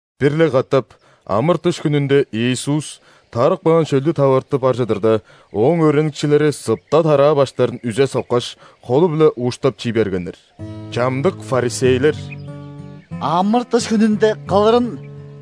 Бир-ле катап ·амыр-дыш хүнүнде Иисус тарып каан шөлдү таварты бар чыдырда, Ооң өөреникчилери сыпта тараа баштарын үзе соккаш, холу-биле ууштап чий бергеннер. Чамдык ·фарисейлер: «Амыр-дыш хүнүнде кылырын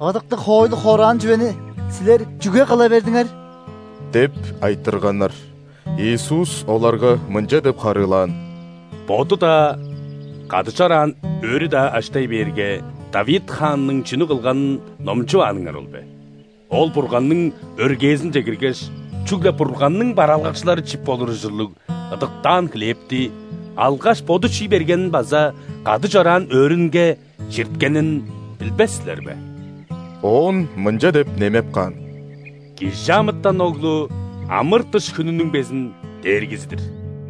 ыдыктыг хоойлу хораан чүвени силер чүге кыла бердиңер?» – деп айтырганнар. Иисус оларга мынча деп харыылаан: «Боду-даа, кады чораан өөрү-даа аштай бээрге, Давид хаанның чүнү кылганын номчувааныңар ол бе? Ол Бурганның өргээзинче киргеш, чүгле Бурганның бараалгакчылары чип болур ужурлуг ыдыктаан хлебти алгаш, боду чий бергенин база кады чораан өөрүнге чирткенин билбес силер бе?» Оон мынча деп немеп каан: «·Кижи амытан Оглу – ·амыр-дыш хүнүнүң безин Дээргизи-дир!»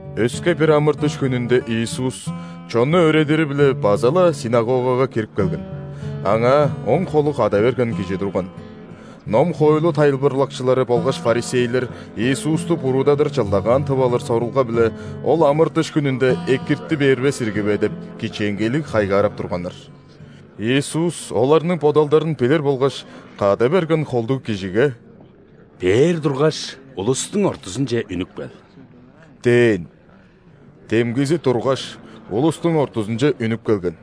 Өске бир амыр-дыш хүнүнде Иисус чонну өөредири-биле база-ла ·синагогага кирип келген. Аңаа оң холу када берген кижи турган. Ном-хоойлу тайылбырлакчылары болгаш ·фарисейлер Иисусту буруудадыр чылдагаан тып алыр сорулга-биле, Ол амыр-дыш хүнүнде экирти бербес ирги бе деп, кичээнгейлиг хайгаарап турганнар. Иисус оларның бодалдарын билир болгаш, када берген холдуг кижиге: «Бээр тургаш, улустуң ортузунче үнүп кел» – дээн. Демгизи тургаш, улустуң ортузунче үнүп келген.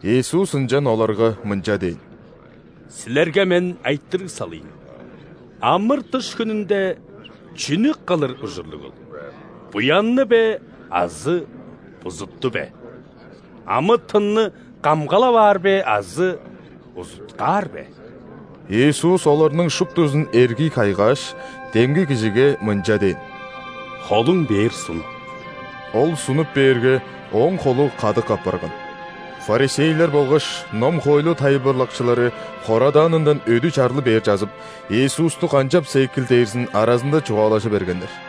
Иисус ынчан оларга мынча дээн: «Силерге Мен айтырыг салыйн: амыр-дыш хүнүнде чүнү кылыр ужурлугул: буянны бе азы бузутту бе? Амы-тынны камгалап аар бе азы узуткаар бе?» Иисус оларның шуптузун эргий кайгааш, демги кижиге мынча дээн: «Холуң бээр сун». Ол сунуп бээрге, ооң холу кадык апарган. Фарисейлер болгаш ном-хоойлу тайылбырлакчылары хорадаанындан өдү чарлы бер чазып, Иисусту канчапса экил дээрзин аразында чугаалажы бергеннер.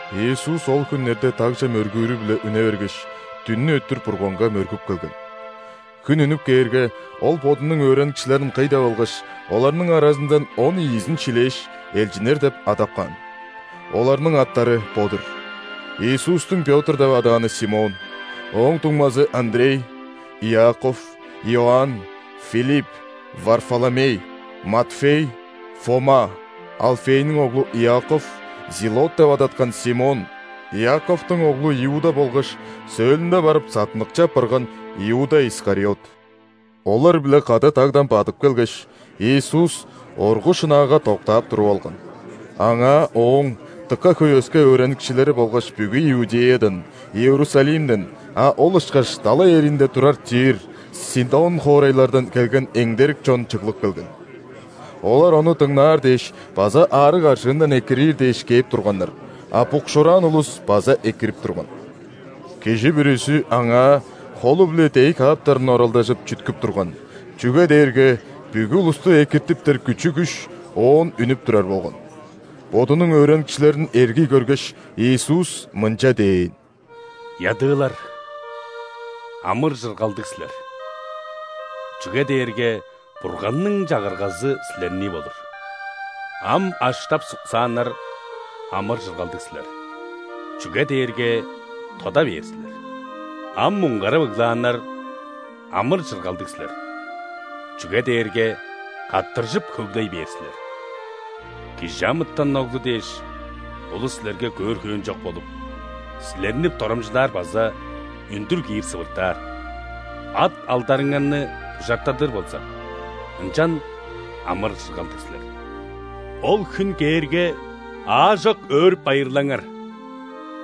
Иисус ол хүннерде дагже мөргүүрү-биле үне бергеш, дүннү өттүр Бурганга мөргүп келген. Хүн үнүп кээрге, Ол Бодунуң өөреникчилерин кый деп алгаш, оларның аразындан он ийизин шилээш, элчиннер деп адап каан. Оларның аттары бо-дур: Иисустуң Пётр деп адааны Симон, ооң дуңмазы Андрей, Иаков, Иоанн, Филипп, Варфоломей, Матфей, Фома, Алфейниң оглу Иаков, Зилот деп адаткан Симон, Иаковтуң оглу Иуда болгаш сөөлүнде барып саттыныкчы апарган Иуда Искариот. Олар-биле кады дагдан бадып келгеш, Иисус оргу шынаага доктаап туруп алган. Аңаа Ооң дыка хөй өске өөреникчилери болгаш бүгү Иудеядан, Иерусалимден, а ол ышкаш далай эриинде турар Тир, Сидон хоорайлардан келген эңдерик чон чыглып келген. Олар Ону дыңнаар дээш база аарыг-аржыындан экириир дээш кээп турганнар, а букшуураан улус база экирип турган. Кижи бүрүзү Аңаа холу-биле дээй кааптарын оралдажып, чүткүп турган, чүге дээрге бүгү улусту экиртиптер күчү-күш Оон үнүп турар болган. Бодунуң өөреникчилерин эргий көргеш, Иисус мынча дээн: «Ядыылар, амыр-чыргалдыг силер, чүге дээрге Бурганның Чагыргазы силернии болур. Ам аштап-суксааннар, амыр-чыргалдыг силер, чүге дээрге тода бээр силер. Ам муңгарап ыглааннар, амыр-чыргалдыг силер, чүге дээрге каттыржып-хөглей бээр силер. ·Кижи амытан Оглу дээш улус силерге көөр хөөн чок болуп, силерни дорамчылаар база үндүр-киир сывыртаар, ат-алдарыңарны бужартадыр болза, ынчан амыр-чыргалдыг силер. Ол хүн кээрге, аажок өөрүп-байырлаңар,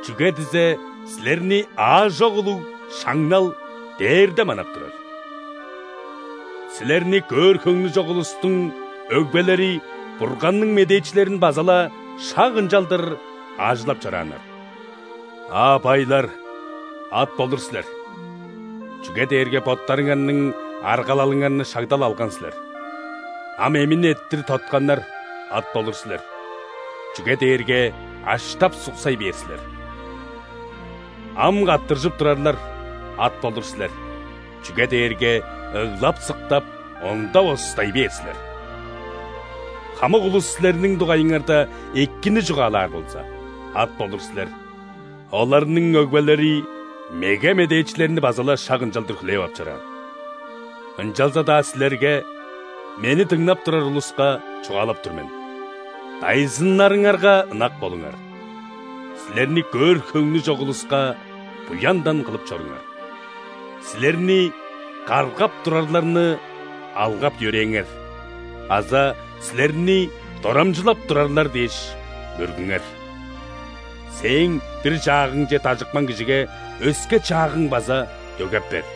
чүге дизе силерни аажок улуг шаңнал дээрде манап турар. Силерни көөр хөңнү чок улустуң өгбелери Бурганның медээчилерин база-ла шак ынчалдыр аажылап чорааннар. А байлар, ат болур силер, чүге дээрге боттарыңарның аргалалыңарны шагда-ла алган силер. Ам эмин эрттир тотканнар, ат болур силер, чүге дээрге аштап-суксай бээр силер. Ам каттыржып турарлар, ат болур силер, чүге дээрге ыглап-сыктап, ондап-остай бээр силер. Хамык улус силерниң дугайыңарда экини чугаалаар болза, ат болур силер, оларның өгбелери меге медээчилерни база-ла шак ынчалдыр хүлээп ап чораан». «Ынчалза-даа силерге, Мени дыңнап турар улуска, чугаалап тур мен: дайзыннарыңарга ынак болуңар, силерни көөр хөңнү чок улуска буяндан кылып чоруңар, силерни каргап турарларны алгап-йөрээңер база силерни дорамчылап турарлар дээш мөргүңер. Сээң бир чаагыңче дажыпкан кижиге өске чаагың база дөгеп бер.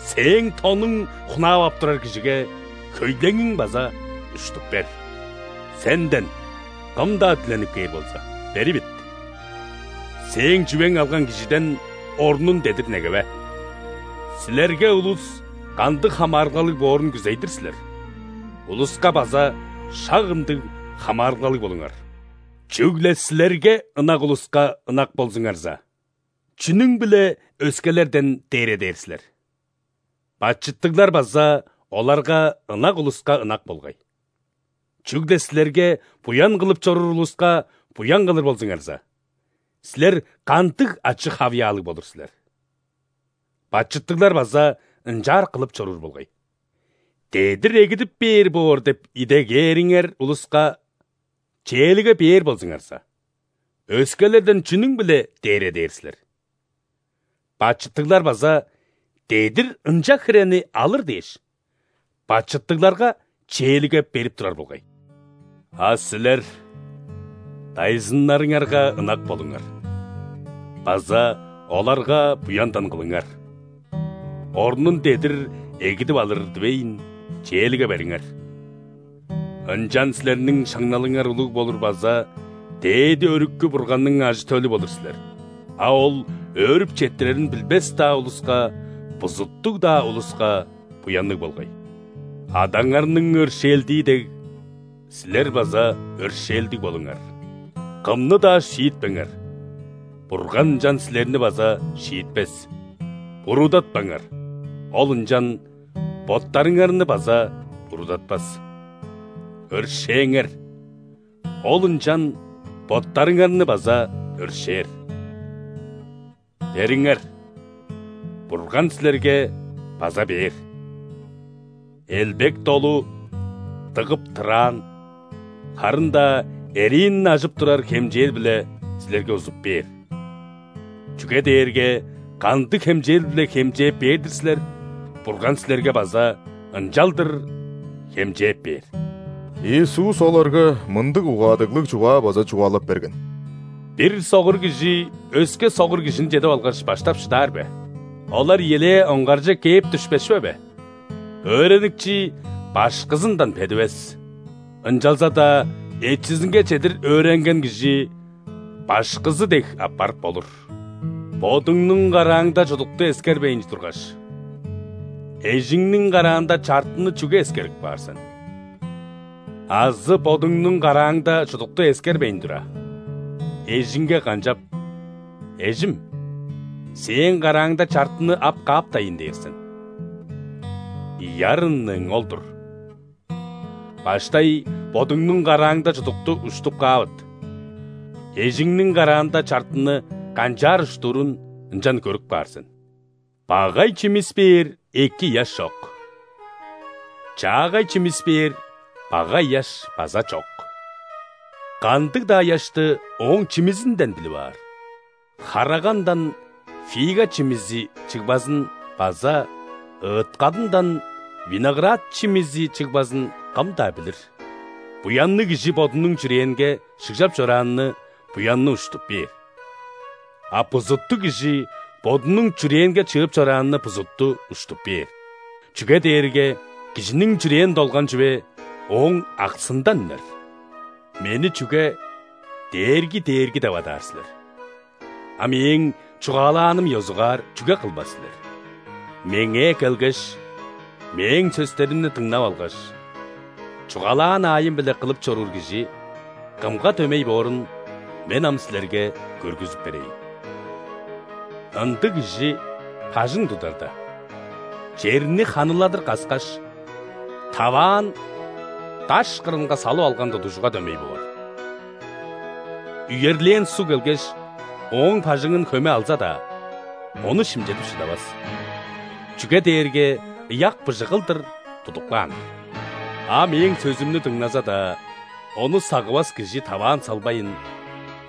Сээң тонуң хунаап ап турар кижиге хөйлеңиң база уштуп бер. Сенден кым-даа диленип кээр болза, беривит; сээң чүвең алган кижиден орнун дедир негеве. Силерге улус кандыг хамаарылгалыг боорун күзей-дир силер, улуска база шак ындыг хамаарылгалыг болуңар. Чүгле силерге ынак улуска ынак болзуңарза, чүнүң-биле өскелерден дээредээр силер? Бачыттыглар база оларга ынак улуска ынак болгай. Чүгле силерге буян кылып чоруур улуска буян кылыр болзуңарза, силер кандыг ачы-хавыяалыг болур силер? Бачыттыглар база ынчаар кылып чоруур болгай. Дедир эгидип бээр боор деп идегээриңер улуска чээлиге бээр болзуңарза, өскелерден чүнүң-биле дээредээр силер? Бачыттыглар база, дедир ынча хирени алыр дээш, бачыттыгларга чээлиге берип турар болгай. А силер дайзыннарыңарга ынак болуңар база оларга буяндан кылыңар, орнун дедир эгидип алыр дивейн, чээлиге бериңер. Ынчан силерниң шаңналыңар улуг болур база Дээди Өрүкү Бурганның ажы-төлү болур силер, а Ол өөрүп четтирерин билбес-даа улуска, бузуттуг-даа улуска буянныг болгай. Адаңарның өршээлдии дег, силер база өршээлдиг болуңар». «Кымны-даа шиитпеңер, Бурган ынчан силерни база шиитпес; буруудатпаңар, Ол ынчан боттарыңарны база буруудатпас; өршээңер, Ол ынчан боттарыңарны база өршээр. Бериңер, Бурган силерге база бээр. Элбек-долу, дыгып-тыраан, харын-даа эриин ажып турар хемчээл-биле силерге узуп бээр, чүге дээрге кандыг хемчээл-биле хемчээп бээр-дир силер, Бурган силерге база ынчалдыр хемчээп бээр». Иисус оларга мындыг угаадыглыг чугаа база чугаалап берген: «Бир согур кижи өске согур кижини чедип алгаш, баштап шыдаар бе? Олар ийилээ оңгарже кээп дүшпес чүве бе? Өөреникчи башкызындан бедивес, ынчалза-даа эчизинге чедир өөренген кижи башкызы дег апарып болур. Бодуңнуң карааңда чудукту эскербейн тургаш, эжиңниң караанда чартыны чүге эскерип каар сен? Азы бодуңнуң карааңда чудукту эскербейн тура, эжиңге канчап: „Эжим, сээң карааңда чартыны ап кааптайн“ – дээр сен? Ийи арынныың ол-дур! Баштай бодуңнуң карааңда чудукту уштуп каавыт, эжиңниң караанда чартыны канчаар уштурун ынчан көрүп каар сен». «Багай чимис бээр эки ыяш чок, чаагай чимис бээр багай ыяш база чок. Кандыг-даа ыяшты ооң чимизинден билип аар. Харагандан фига чимизи чыгбазын база ыт-кадындан виноград чимизи чыгбазын кым-даа билир. Буянныг кижи бодунуң чүрээнге шыгжап чорааны буянны уштуп бээр, а бузуттуг кижи бодунуң чүрээнге чыып чорааны бузутту уштуп бээр, чүге дээрге кижиниң чүрээн долган чүве ооң аксындан үнер». «Мени чүге „Дээрги, Дээрги“ деп адаар силер, а Мээң чугаалааным ёзугаар чүге кылбас силер? Меңээ келгеш, Мээң сөстеримни дыңнап алгаш, чугаалаан аайым-биле кылып чоруур кижи кымга дөмей боорун Мен ам силерге көргүзүп берейн. Ындыг кижи бажың тударда, черни ханыладыр каскаш, таваан даш кырынга салып алган тудугжуга дөмей боор. Үерлээн суг келгеш, ооң бажыңын хөме алза-даа, ону шимчедип шыдавас, чүге дээрге ыяк быжыг кылдыр тудуп каан-дыр. А Мээң сөзүмнү дыңназа-даа, ону сагывас кижи таваан салбайн,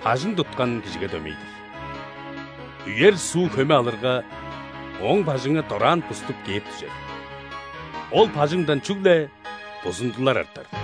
бажың туткан кижиге дөмей-дир. Үер суу хөме алырга, ооң бажыңы дораан буступ кээп дүжер. Ол бажыңдан чүгле бузундулар артар».